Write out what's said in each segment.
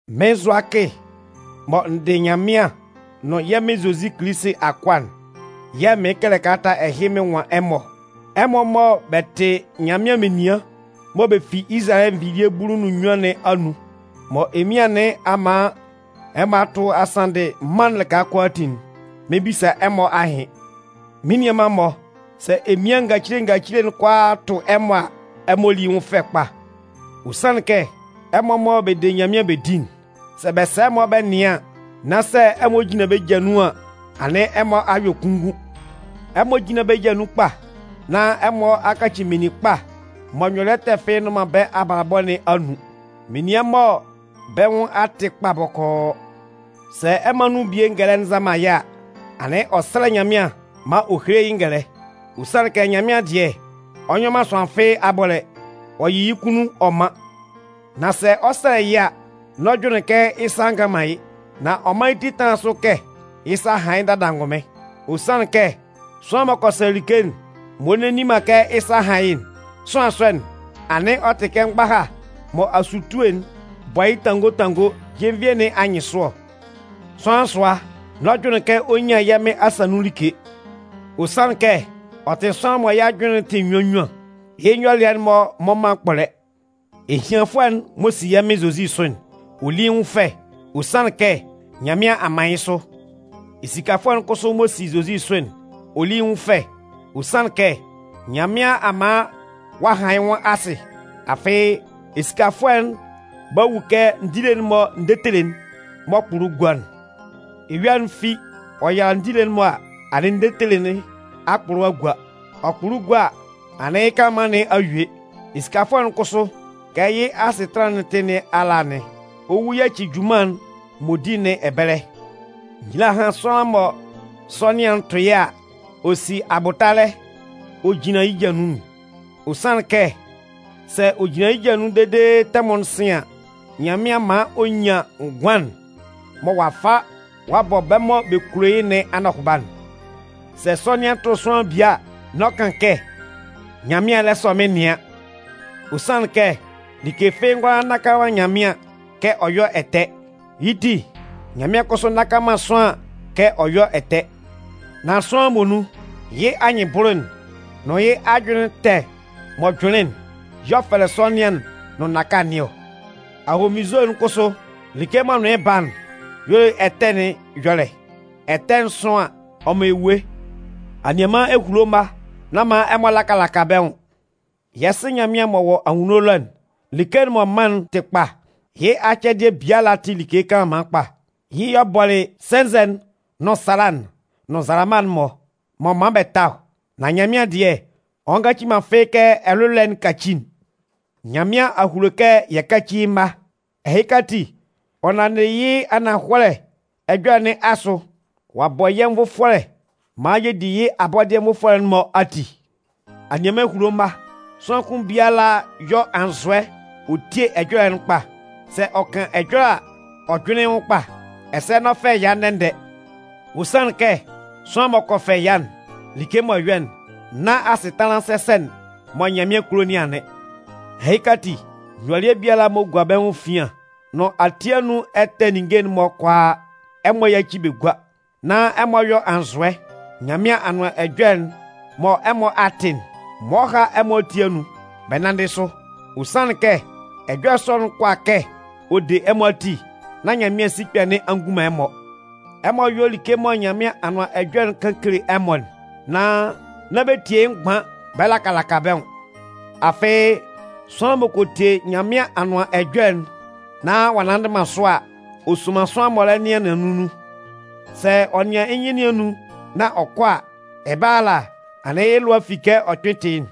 Mɩ́n Zʋakɩ mɔ n dɩ Nyanmɩan nʋn yɛ́ Mɩn Zozi Kilisi akʋa'n yɛ̂ mɩɩn kɛlɛ kalata ɛhɩ mɩn nwan ɛmɔ ɔ. Ɛmɔ mɔ bɛ tɩ Nyanmɩan menian mɔ bɛ fi Izalayɛ nvilie bulu nʋn nnyuan nɩn anun, mɔ emian nɩn a man ɛmɔ a tʋ a sanndɩ mân'n lɩka kʋalaatin'n, mɩn 'bisa ɛmɔ ahɩn. Mɩ́n nianman-mɔ, sɛ emian ngacile ngacile'n kʋalaa tʋ ɛmɔ a, ɛmɔ lí yɩ́ nwʋn fɛ kpa. Ɔ sanlɩn kɛ ɛmɔ mɔ bɛ de Nyanmɩan bɛ di'n, sɛ bɛ sa ɛmɔ bɛ nɩan, nan sɛ ɛmɔ jin bɛ́ ja nun an, anɩn ɛmɔ a yɔ kunngun. Ɛmɔ jínlan bɛ́ ja nun kpa, nán ɛmɔ a kaci meninkpa mɔ nyɔlɩɛ ɛtɛ fɩ́ɩ́ nnʋn man bɛ́ abalabɔ nɩn anun, menian mɔ bɛ́ nwʋn a tɩ kpa bɔkɔɔ. Sɛ ɛmɔ anun bie ngɛlɛ'n nza man yɩ́ a, anɩn ɔ 'sɛlɛ Nyanmɩan maan ɔ héle yɩ́ ngɛlɛ. Ɔ sanlɩn kɛ Nyanmɩan dɩɛ, ɔ nyɔ man sʋanlan abɔlɛ, ɔ yɩ yɩ́ kʋnnun ɔ man. Nan sɛ ɔ 'sɛlɛ yɩ́ a, n'ɔ jʋnlɩn kɛ yɩ́ sa ngan man yɩ́, nan ɔ mán yɩ́ ti tánlan sʋ kɛ yɩ́ sa a han yɩ́ dada angʋnmɩn. Ɔ sanlɩn kɛ sʋanlan m'ɔ kɔ sɛlɛ like m'ɔ nne nni man kɛ yɩ́ sa a han yɩ́'n, sʋanlan sɔ'n, anɩn ɔ tɩ kɛ mgbaha mɔ asutue'n bɔ yɩ́ tango tango jenvie nɩn anyɩnsʋ ɔ. Sʋanlan sʋa, n'ɔ jʋnlɩn kɛ ɔ 'nyan yɛ́ Mɩn asa nun like. Ɔ sanlɩn kɛ ɔ tɩ sʋanlan mɔ yɩ́ ajʋnlɩn tɩ nnyuan nnyuan, yɩ́ nyɔlɩɛ'n-mɔ mmɔ man kpɔlɛ. Ehianfʋɛ'n m'ɔ si yɛ́ Mɩn Zozi sʋ'n, ɔ lí yɩ́ nwʋn fɛ, ɔ sanlɩn kɛ Nyanmɩan a man yɩ́ sʋ. Esikafʋɛ'n kʋsʋ m'ɔ si Zozi sʋ'n, ɔ lí yɩ́ nwʋn fɛ, ɔ sanlɩn kɛ Nyanmɩan a man ɔ'a han yɩ́ nwʋn asɩ. Afɩ esikafʋɛ'n 'ba wu kɛ ndile'n-mɔ ndetele'n m'ɔ kpʋlʋ gua'n. Eyua'n fi ɔ yala ndile'n-mɔ a, anɩn ndetele nɩn a kpʋlʋ a gua. Ɔ kpʋlʋ gua a, anɩn yɩ́ kanlanman nɩn a yue. Esikafʋɛ'n kʋsʋ, kɛ yɩ́ asɩtanlan'n tɩ yɩ́ nɩn ala anɩn. Ɔ 'wu yaci junman'n m'ɔ di nɩn ɛbɛlɛ. Nyila hán sʋanlan mɔ sɔnɩan'n tʋ yɩ́ a, ɔ si abʋtalɛ ɔ jinlan yɩ́ ja nun'n. Ɔ sanlɩn kɛ sɛ ɔ jinlan yɩ́ ja nun dede tɛmʋn'n sɩn an, Nyanmɩan 'man ɔ nyan ngʋan'n mɔ ɔ'a fa ɔ'a bɔ bɛ́ mɔ bɛ kulo yɩ́ nɩn anɔhʋba'n. Sɛ sɔnɩan tʋ sʋanlan bie a, n'ɔ kan kɛ: “Nyanmɩan lɛ sɔ mɩ́n nɩan”. Ɔ sanlɩn kɛ like fɩ́ɩ́ ngʋala nnaka man Nyanmɩan kɛ ɔ yɔ́ ɛtɛ. Yɩ́ ti, Nyanmɩan kʋsʋ nnaka man sʋanlan kɛ ɔ yɔ́ ɛtɛ. Nan sʋanlan muonun, yɩ́ anyɩnbʋlʋ'n nʋn yɩ́ ajʋnlɩn ɛtɛ m'ɔ jʋnlɩn'n, y'ɔ fɛlɛ sɔnɩan'n nʋn nnaka nɩn ɔ. Ahonvinnzo'n kʋsʋ, like m'ɔ nʋn yɩ́ ba'n y'ɔ le ɛtɛ nɩn ɛyɔlɛ. Ɛtɛ'n sʋn an, ɔ man ewue. Anianman ehulo mma, nán man ɛmɔ laka laka bɛ́ nwʋn. Yɛ́ Sɩ Nyanmɩan m'ɔ wɔ anwunno ɛlɔ'n, like'n m'ɔ man'n tɩ kpa. Yɩ́ acɛdɩɛ biala tɩ like kanlanman kpa. Yɩ́ y'ɔ bɔlɩ sɛnzɛ'n nʋn sala'n nʋn nzalama'n-mɔ, m'ɔ man bɛ ta ɔ. Nan Nyanmɩan dɩɛ, ɔ ngaci man fɩ́ɩ́ kɛ ɛlʋlɔɛ'n kaci'n. Nyanmɩan a hulo kɛ yɛ káci yɩ́ mma. Ɛhɩka ati, ɔ nanndɩ yɩ́ ananhɔlɛ ɛjɔlɛ nɩn asʋ, ɔ'a bɔ yɛ́ nvʋfɔlɛ maan yɛ di yɩ́ abɔdɩɛ nvʋfɔlɛ'n-mɔ ati. Anianman ehulo mma, sʋanlan kʋn biala yɔ́ anzʋɛ ɔ tíe ɛjɔlɛ'n kpa. Sɛ ɔ 'kan ɛjɔlɛ a, ɔ jʋ́nlɩn yɩ́ nwʋn kpa. Ɛsɛ n'ɔ fɛ ɛya ndɛ-ndɛ. Ɔ sanlɩn kɛ sʋanlan m'ɔ kɔ fɛ ɛya'n, like m'ɔ yɔ'n, nán asɩtanlan sɛsɛ'n mɔ Nyanmɩan kulo nɩn anɩn. Ɛhɩka ati, nyɔlɩɛ biala m'ɔ gua bɛ́ nwʋn efian nʋn ati anun ɛtɛ ninnge'n-mɔ kʋalaa, ɛmɔ yáci bɛ gúa. Nan ɛmɔ yɔ́ anzʋɛ, Nyanmɩan Anʋan Ɛjɔlɛ'n mɔ ɛmɔ a tɩ'n, m'ɔ há ɛmɔ ati anun bɛ nánndɩ sʋ. Ɔ sanlɩn kɛ ɛjɔlɛ sɔ'n kʋala kɛ ɔ de ɛmɔ ati nán Nyanmɩan sikpɛ nɩn a ngun man ɛmɔ. Ɛmɔ yɔ́ like mɔ Nyanmɩan Anʋan Ɛjɔlɛ'n kan kele ɛmɔ'n, nan nán bɛ tie yɩ́ mgban bɛ laka laka bɛ́ nwʋn. Afɩ, sʋanlan m'ɔ kɔ tie Nyanmɩan Anʋan Ɛjɔlɛ'n nán ɔ'a nnanndɩ man sʋ a, ɔ soman sʋanlan m'ɔ lɛ nɩan nɩannun nun ɔ. Sɛ ɔ nɩan yɩ́ nyɩn nɩn anun nán ɔ kɔ a, ɛbɛlɛ ala, anɩn yɩ́ lʋa a fi kɛ ɔ kpɩn ɔ tɩ yɩ́'n.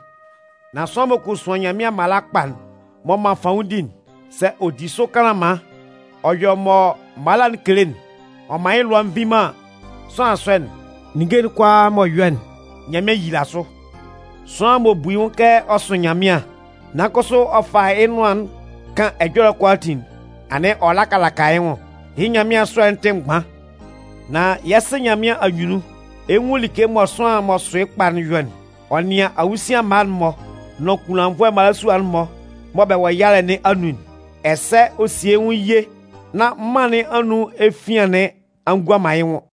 Nan sʋanlan m'ɔ kɔ suan Nyanmɩan mala kpa'n m'ɔ man fanwʋndi'n, sɛ ɔ di sʋ kanlanman, ɔ yɔ mɔ mala'n kele'n, ɔ man yɩ́ lʋa nvi man an, sʋanlan sɔ'n, ninnge'n kʋalaa m'ɔ yɔ'n, Nyanmɩan 'yila sʋ. Sʋanlan m'ɔ bu yɩ́ nwʋn kɛ ɔ sʋ Nyanmɩan, nan kʋsʋ ɔ fa yɩ́ nʋan'n kan ɛjɔlɛ'n kʋalaatin'n, anɩn ɔ laka laka yɩ́ nwʋn, yɩ́ Nyanmɩan ɛsʋɛ'n tɩ mgban. Nan yɛ́ Sɩ Nyanmɩan anyunnun, ɛ 'nwun like mɔ sʋanlan m'ɔ sʋ yɩ́ kpa'n yɔ'n: ɔ nɩan awusian mma'n-mɔ nʋn kunlannvʋɛ mmalasua'n-mɔ mɔ bɛ wɔ yalɛ nɩn anun'n. Ɛsɛ ɔ sie yɩ́ nwʋn ye nán mân nɩn anun efian nɩn a gua man yɩ́ nwʋn.